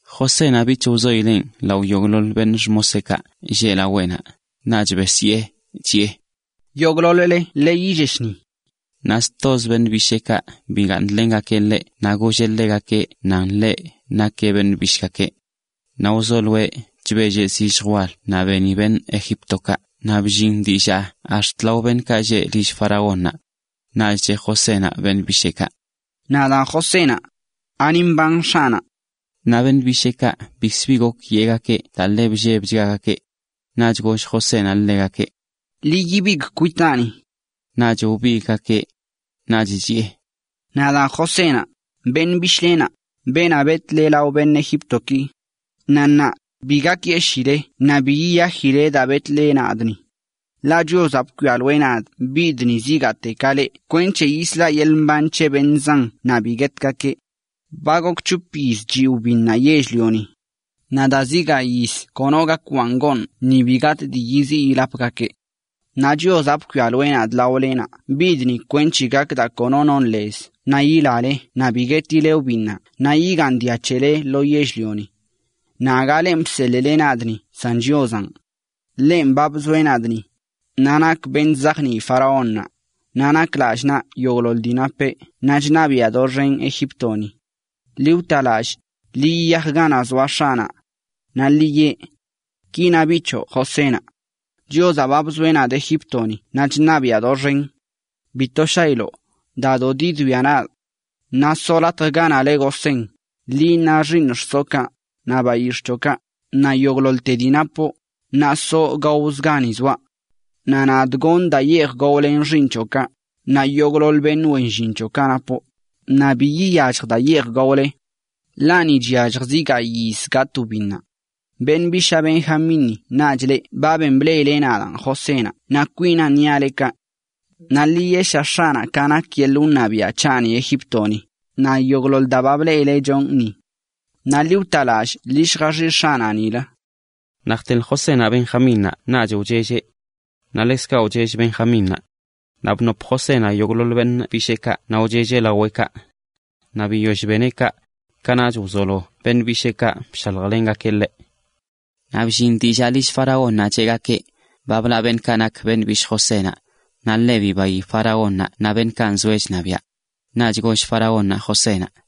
Josénaꞌ bich wzoileꞌn lao yogꞌḻoḻ beṉꞌ xmoseꞌkaꞌ lleꞌ laweꞌnaꞌ, naꞌch besyee, chiꞌe: “¡Yogꞌḻoḻ-le ḻi yillesh ni!” Naꞌ stozə beṉꞌ bisheekaꞌ bigaaṉlengakeꞌ ḻeꞌ naꞌ golleꞌ ḻegakeꞌ nan nakeꞌ beṉꞌ bishꞌgakeꞌ. Naꞌ wzoloeꞌ chbelleꞌ zilljə wal naꞌ beni beṉꞌ Egíptokaꞌ naꞌ bllin dillaa ax̱t lao beṉꞌkaꞌ lleꞌ lill faraónnaꞌ. Naꞌ cheꞌ Josénaꞌ beṉꞌ bisheekaꞌ: ―Nadaan Josénaꞌ. ¿Ani mban x̱aꞌnaꞌ? Naꞌ beṉꞌ bisheekaꞌ bikzə bi gok yeꞌgakeꞌ daa ḻe bllebchgagakeꞌ. Naꞌch goll Josénaꞌ ḻegakeꞌ: ―Ḻi ibigꞌ kwitaani. Naꞌch wbigꞌgakeꞌ. Naꞌch chiꞌe: ―Nadaan Josénaꞌ, beṉꞌ bishꞌlenaꞌ, beenaꞌ betꞌle lao beṉꞌ Egíptoki. Naꞌ ṉaa, bi gakyeshiile naꞌ bi yiyajileꞌ daa betꞌle nadꞌ ni. Ḻaꞌ Chiozaꞌ bkwialoeꞌ nadꞌ bidꞌ ni zigaate ka leꞌ kwenc̱he yislaꞌ yeḻꞌ mban c̱he beṉꞌ zan naꞌ bi guetgakeꞌ. Ba gok c̱hop yiz chiꞌ wbinnaꞌ yell-lioni, naꞌ daa zi gayꞌ yiz kono gak gaz gaaṉ ni bi gatꞌ dii yiziꞌ yilapgakeꞌ. Naꞌ Chiozaꞌ bkwialoeꞌ nadꞌ laolenaꞌ bidꞌ ni kwenc̱he gak daa kono non lez naꞌ yilale naꞌ bi guetileꞌ wbinnaꞌ naꞌ igaaṉ dia c̱hele lo yell-lioni. Naꞌ aga lenꞌ bseḻꞌle nadꞌ ni san Chiozaꞌn. Ḻenꞌ ba bzoeꞌ nadꞌ ni, naꞌ nakꞌ beṉꞌ chzajnii faraónnaꞌ, naꞌ nak lallꞌ naꞌ yogꞌḻoḻ dii napeꞌ naꞌ chṉabiꞌa doxen Egíptoni. Ḻi wta lallꞌ, ḻi yiyaj ganaꞌ zoa x̱aꞌnaꞌ. Naꞌ ḻi yeꞌ(): “Ki na biꞌ c̱hoꞌ Josénaꞌ: Chiozaꞌ ba bzoeꞌ nadꞌ Egíptoni naꞌ chṉabiꞌa doxenan. Bito shailoꞌ, dado diwia nadꞌ. Naꞌ soꞌ latjaꞌ ganaꞌ le Gosén, liꞌ naꞌ xiiṉ xsoꞌkaꞌ, naꞌ bayix̱ꞌ c̱hoꞌkaꞌ, naꞌ yogꞌḻoḻte dii napoꞌ, naꞌ soꞌ gaozə gani zoaꞌ. Naꞌ nadꞌ goṉꞌ daa yeej gaolen xiiṉ c̱hoꞌkaꞌ, naꞌ yogꞌḻoḻ beṉꞌ wen llin c̱hoꞌkaꞌ napoꞌ, naꞌ bi iyallj daa yeej gaole. Ḻaꞌ ni chyallj zi gayꞌ yiz gatꞌ wbinnaꞌ.” Beṉꞌ bishaa Benjamínni naꞌch leꞌ ba ben bleꞌile nadaan Josénaꞌ naꞌ kwinaan niaꞌ leꞌ kaꞌ. Naꞌ ḻi yeꞌsha x̱aꞌnaꞌ ka nak yeḻꞌ wṉabiaꞌ c̱haꞌni Egíptoni, naꞌ yogꞌḻoḻ daa ba bleꞌile chonꞌ ni. Naꞌ ḻi wtalallꞌ, ḻi lljaxiꞌsha x̱aꞌnaꞌ nilə. Naꞌ jteḻ Josénaꞌ Benjmínnaꞌ naꞌch wchelleꞌ. Naꞌ ḻekzkaꞌ wchell Benjamínnaꞌ. Naꞌ bnop Josénaꞌ yogꞌḻoḻ beṉꞌ bisheekaꞌ naꞌ wchelleꞌ laweꞌkaꞌ. Naꞌ biyoll beneꞌ kaꞌ, kanaꞌch wzolo beṉꞌ bisheekaꞌ bshaljlengakeꞌ ḻeꞌ. Naꞌ bllin dillaa lill faraónnaꞌ cheꞌgakeꞌ: “Ba blaꞌ beṉꞌkaꞌ nak beṉꞌ bishꞌ Josénaꞌ.” Naꞌ ḻe bibayi faraónnaꞌ naꞌ beṉꞌkaꞌ nzoeꞌ chṉabiaꞌ. Naꞌch goll faraónnaꞌ Josénaꞌ: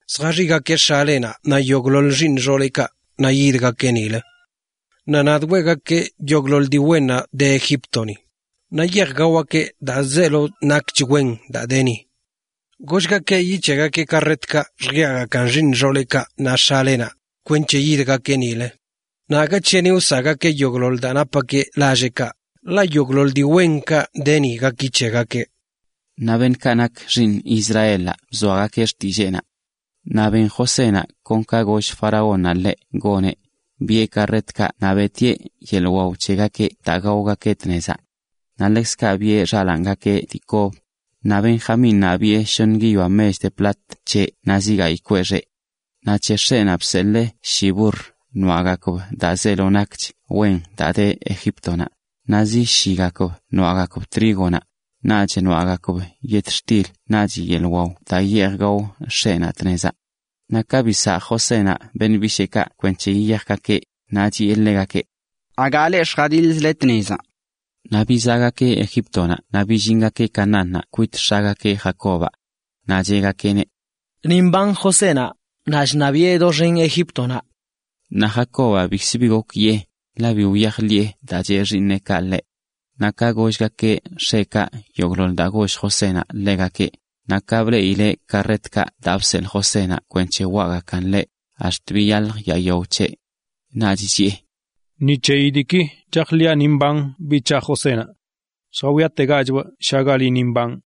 zjaxiꞌgakeꞌ x̱alenaꞌ naꞌ yogꞌḻoḻ xiiṉ xooleꞌkaꞌ naꞌ yidgakeꞌ nilə. Naꞌ nadꞌ weꞌgakee yogꞌḻoḻ dii wennaꞌ de Egíptoni. Naꞌ yeej gaogakeꞌ daa zeelo nakch wen daa de ni. Gollgakeꞌ yic̱heꞌgakeꞌ karretkaꞌ lljiaꞌgakan xiiṉ xooleꞌkaꞌ naꞌ x̱alenaꞌ, kwenc̱he yidgakeꞌ nilə. Naꞌ aga c̱hini wsaꞌgakeꞌ yogꞌḻoḻ daa napgakeꞌ lalleꞌkaꞌ, ḻaꞌ yogꞌḻoḻ dii wenkaꞌ de ni gaki c̱hegakeꞌ. Naꞌ beṉꞌkaꞌ nak xiiṉ Israelaꞌ bzoagakeꞌ xtilleenaꞌ. Naꞌ ben Josénaꞌ kon ka goll faraónnaꞌ ḻeꞌ goneꞌ, biꞌe karretkaꞌ naꞌ beꞌtieꞌ yeḻꞌ wao c̱hegakeꞌ daa gaogakeꞌ tnezaꞌ. Naꞌ ḻekzkaꞌ biꞌe xalaangakeꞌ dii kob, naꞌ Benjamínnaꞌ biꞌe shoṉə guiyoa mech de plat c̱heꞌ naꞌ zi gayꞌ kweꞌ xeꞌ. Naꞌ c̱he x̱eꞌnaꞌ bseḻee shi burr noaꞌgakb daa zeelo nakch wen daa de Egíptonaꞌ, naꞌ zi shigakb noaꞌgakb trígonaꞌ, naꞌch yetxtil naꞌch yeḻꞌ wao daa yeej gao x̱eꞌnaꞌ tnezaꞌ. Naꞌ ka bisaa Josénaꞌ beṉꞌ bisheekaꞌ kwenc̱he yiyajgakeꞌ, naꞌ chiꞌe ḻegakeꞌ: ―Aga leꞌ lljadiḻzle tnezaꞌ. Naꞌ bizaꞌgakeꞌ Egíptonaꞌ naꞌ billingakeꞌ Canaánnaꞌ kwit x̱agakeꞌ, (,) Jacobaꞌ. Naꞌ cheꞌgakeꞌneꞌ: ―Ni mban Josénaꞌ, naꞌ chṉabiꞌe doxen Egíptonaꞌ. Naꞌ Jacobaꞌ bikzə bi gok yee, ḻaꞌ bi wyajḻiꞌe daa cheꞌ xiiṉeꞌkaꞌ ḻeꞌ. Naꞌ ka gollgakeꞌ x̱eꞌkaꞌ yogꞌḻoḻ daa goll Josénaꞌ ḻegakeꞌ, naꞌ ka bleꞌileꞌ karretkaꞌ daa bseḻꞌ Josénaꞌ kwenc̱he waꞌgakan ḻeꞌ, ax̱t biyalj yaa yao c̱heꞌ. Naꞌch chiꞌe: “Ni c̱heyi diiki chajḻiꞌa ni mban José c̱haꞌnaꞌ. Lljawiategachꞌbꞌ shagali ni mbanꞌ.”